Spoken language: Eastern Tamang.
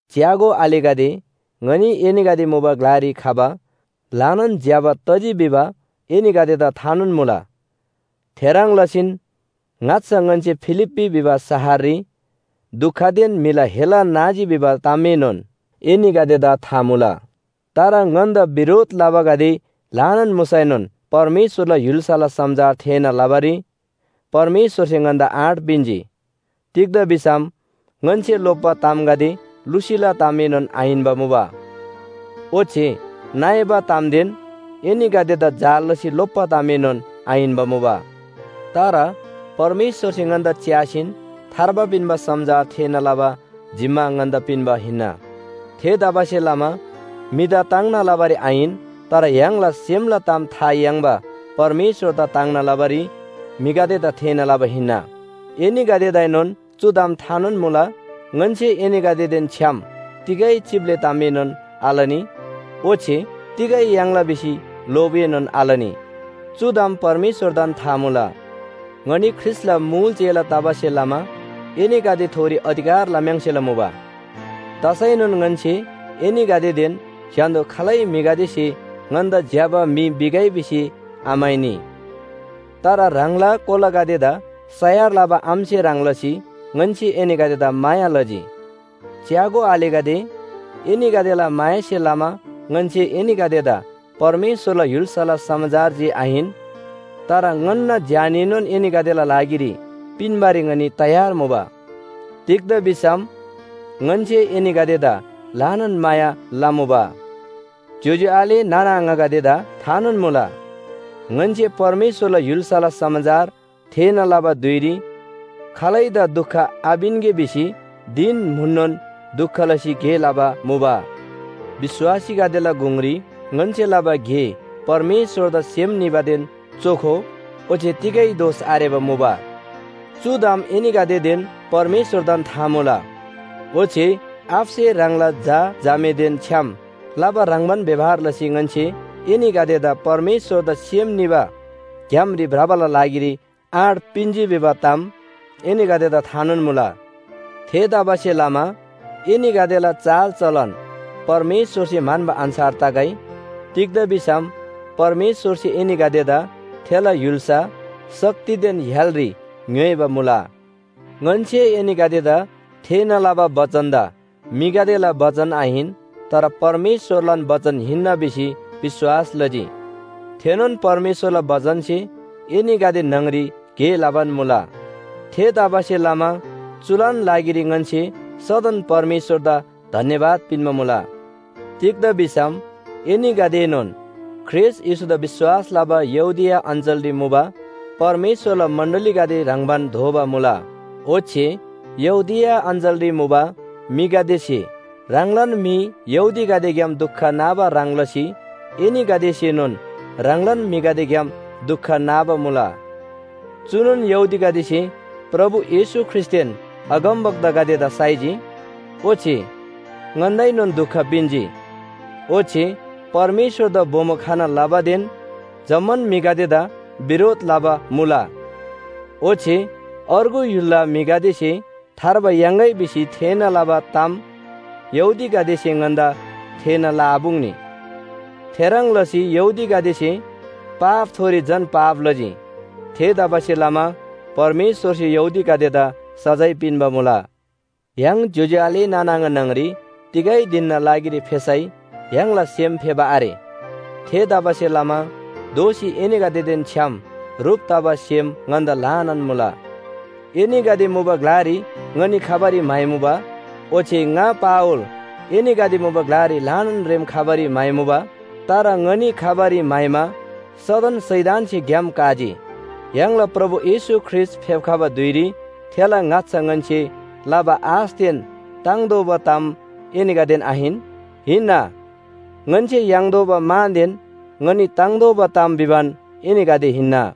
च्‍यागो आलेगदे, ङनी एनीगदे मुबा ग्‍लारी खबा ल्‍हानान ज्‍यबा तजी भिबा एनीगदेदा थानोन मुला। थेह्रङ् लसीन ङाच्‍छा ङन्‍से फिलिप्‍पी भिबा शहररी दुखदेन म्‍हिला हेला नाजी भिबा तामएनोन एनीगदेदा था मुला। तर ङन्‍दा बिरोध लबागदे ल्‍हानान मुसैनोन परमेश्‍वरला य्‍हुल्‍साला समाचार थेःना लबारी परमेश्‍वरसे ङन्‍दा आँट पिन्‍जी। तिग्‍दा भिसम ङन्‍से लोप्‍बा तामगदे लुसीला तामएनोन आहिन्‍बा मुबा। ओच्‍छे नइबा तामदेन एनीगदेदा जाल लसी लोप्‍बा तामएनोन आहिन्‍बा मुबा। तर परमेश्‍वरसे ङन्‍दा च्‍यासीन थार्बा पिन्‍बा समाचार थेःना लबा जिम्‍मा ङन्‍दा पिन्‍बा हिन्‍ना। थेतबासेलमा म्‍हिदा ताङ्ना लबारी आहिन तर य्‍हाङला सेमला ताम था याङ्बा परमेश्‍वरदा ताङ्ना लबारी म्‍हिगदेदा थेःना लबा हिन्‍ना। एनीगदेदाएनोन चु ताम थानोन मुला ङन्‍से एनीगदेदेन छ्‌याम तिगै चिप्‍ले तामएनोन आलनी ओच्‍छे तिगै याङ्ला भिसी लोभएनोन आलनी। चु ताम परमेश्‍वरदान था मुला। ङनी ख्रीष्‍टला मुल चेला तबासे लमा एनीगदेथोरी अधिकार लखम्‍सेला मुबा। तसैनोन ङन्‍से एनीगदेदेन स्‍य्‍हान्‍दो खालै म्‍हिगदेसे ङन्‍दा ज्‍यबा म्‍हि भिगै भिसी आम्‍हाइनी। तर ह्राङला कोलागदेदा सयार लबा आमासे ह्रङ् लसी ङन्‍से एनीगदेदा माया लजी। च्‍यागो आलेगदे, एनीगदेला मायासे लमा ङन्‍से एनीगदेदा परमेश्‍वरला य्‍हुल्‍साला समाचार जे आहिन, तर ङन्‍ना ज्‍यानएनोन एनीगदेला लागिरी पिन्‍बारी ङनी तयार मुबा। तिग्‍दा भिसम ङन्‍से एनीगदेदा ल्‍हानान माया लमुबा। ज्‍योज्‍यो आले नाना आङागदेदा थानोन मुला। ङन्‍से परमेश्‍वरला य्‍हुल्‍साला समाचार थेःना लबा धुइरी खालैदा दुख आपिन्‍गे भिसी धिन म्‍हुननोन दुख लसी गे लबा मुबा। विश्‍वासीगदेला गुङरी ङन्‍से लबा गे परमेश्‍वरदा सेम निबादेन चोखो ओच्‍छे तिगै दोष आरेबा मुबा। चु ताम एनीगदेदेन परमेश्‍वरदान था मुला। ओच्‍छे आबासे ह्राङला झा झामेदेन छ्‌याम लबा ह्रङ्‌बान व्‍यवहार लसी ङन्‍से एनीगदेदा परमेश्‍वरदा सेम निबा ग्‍यामरी भ्रबाला लागिरी आँट पिन्‍जी भिबा ताम एनीगदेदा थानोन मुला। थेतबासेलमा एनीगदेला चालचलन परमेश्‍वरसे म्‍हन्‍बा अन्‍छार तगै। तिग्‍दा भिसम परमेश्‍वरसे एनीगदेदा थेला य्‍हुल्‍सा, शक्तिदेन य्‍हालरी ङ्‌योइबा मुला। ङन्‍से एनीगदेदा थेःना लबा बचनदा म्‍हिगदेला बचन आहिन तर परमेश्‍वरलान बचन हिन्‍ना भिसी विश्‍वास लजी। थेनोन परमेश्‍वरला बचनसे एनीगदे न्‍हङरी गे लबान मुला। थेतबासेलमा चुलान लागिरी ङन्‍से सदन परमेश्‍वरदा धन्‍यवाद पिन्‍बा मुला। तिग्‍दा भिसम एनीगदेएनोन ख्रीष्‍ट येशूदा विश्‍वास लबा यहूदिया अञ्‍चलरी मुबा परमेश्‍वरला मण्‍डलीगदे ह्रङ्‌बान दोबा मुला। ओच्‍छे यहूदिया अञ्‍चलरी मुबा म्‍हिगदेसे ह्राङलान म्‍हि यहूदीगदेग्‍याम दुख नाबा ह्रङ् लसी एनीगदेसेनोन ह्राङलान म्‍हिगदेग्‍याम दुख नाबा मुला। चुनोन यहूदीगदेसे प्रभु येशू ख्रीष्‍टदेन अगमवक्तागदेदा साइजी, ओच्‍छे ङन्‍दाएनोन दुख पिन्‍जी, ओच्‍छे परमेश्‍वरदा बोमो खना लबादेन जम्‍मान म्‍हिगदेदा बिरोध लबा मुला। ओच्‍छे अर्गु य्‍हुलला म्‍हिगदेसे थार्बा याङ्‌गै भिसी थेःना लबा ताम यहूदीगदेसे ङन्‍दा थेःना लआपुङ्नी। थेह्रङ् लसी यहूदीगदेसे पापथोरी झन पाप लजी। थेतबासेलमा परमेश्‍वरसे यहूदीगदेदा सजाय पिन्‍बा मुला। य्‍हाङ ज्‍योज्‍यो आले नाना आङा न्‍हङरी तिगै धिनना लागिरी फेसै य्‍हाङला सेम फेबा आरे। थेतबासेलमा दोःसी एनीगदेदेन छ्‌याम ह्रुप तबा सेम ङन्‍दा ल्‍हानान मुला। एनीगदे मुबा ग्‍लारी ङनी खबारी म्‍हाइमुबा। ओच्‍छे ङा पावल एनीगदे मुबा ग्‍लारी ल्‍हानान रेम खबारी म्‍हाइमुबा। तर ङनी खबारी म्‍हाइमा सदन शैतानसे ग्‍याम काजी। य्‍हाङला प्रभु येशू ख्रीष्‍ट फेप्‍खबा धुइरी थेला ङाच्‍छा ङन्‍से लबा आशदेन ताङ्तोःबा ताम एनीगदेन आहिन? हिन्‍ना। ङन्‍से याङ्तोःबा मानदेन ङनी ताङ्तोःबा ताम भिबान एनीगदे हिन्‍ना।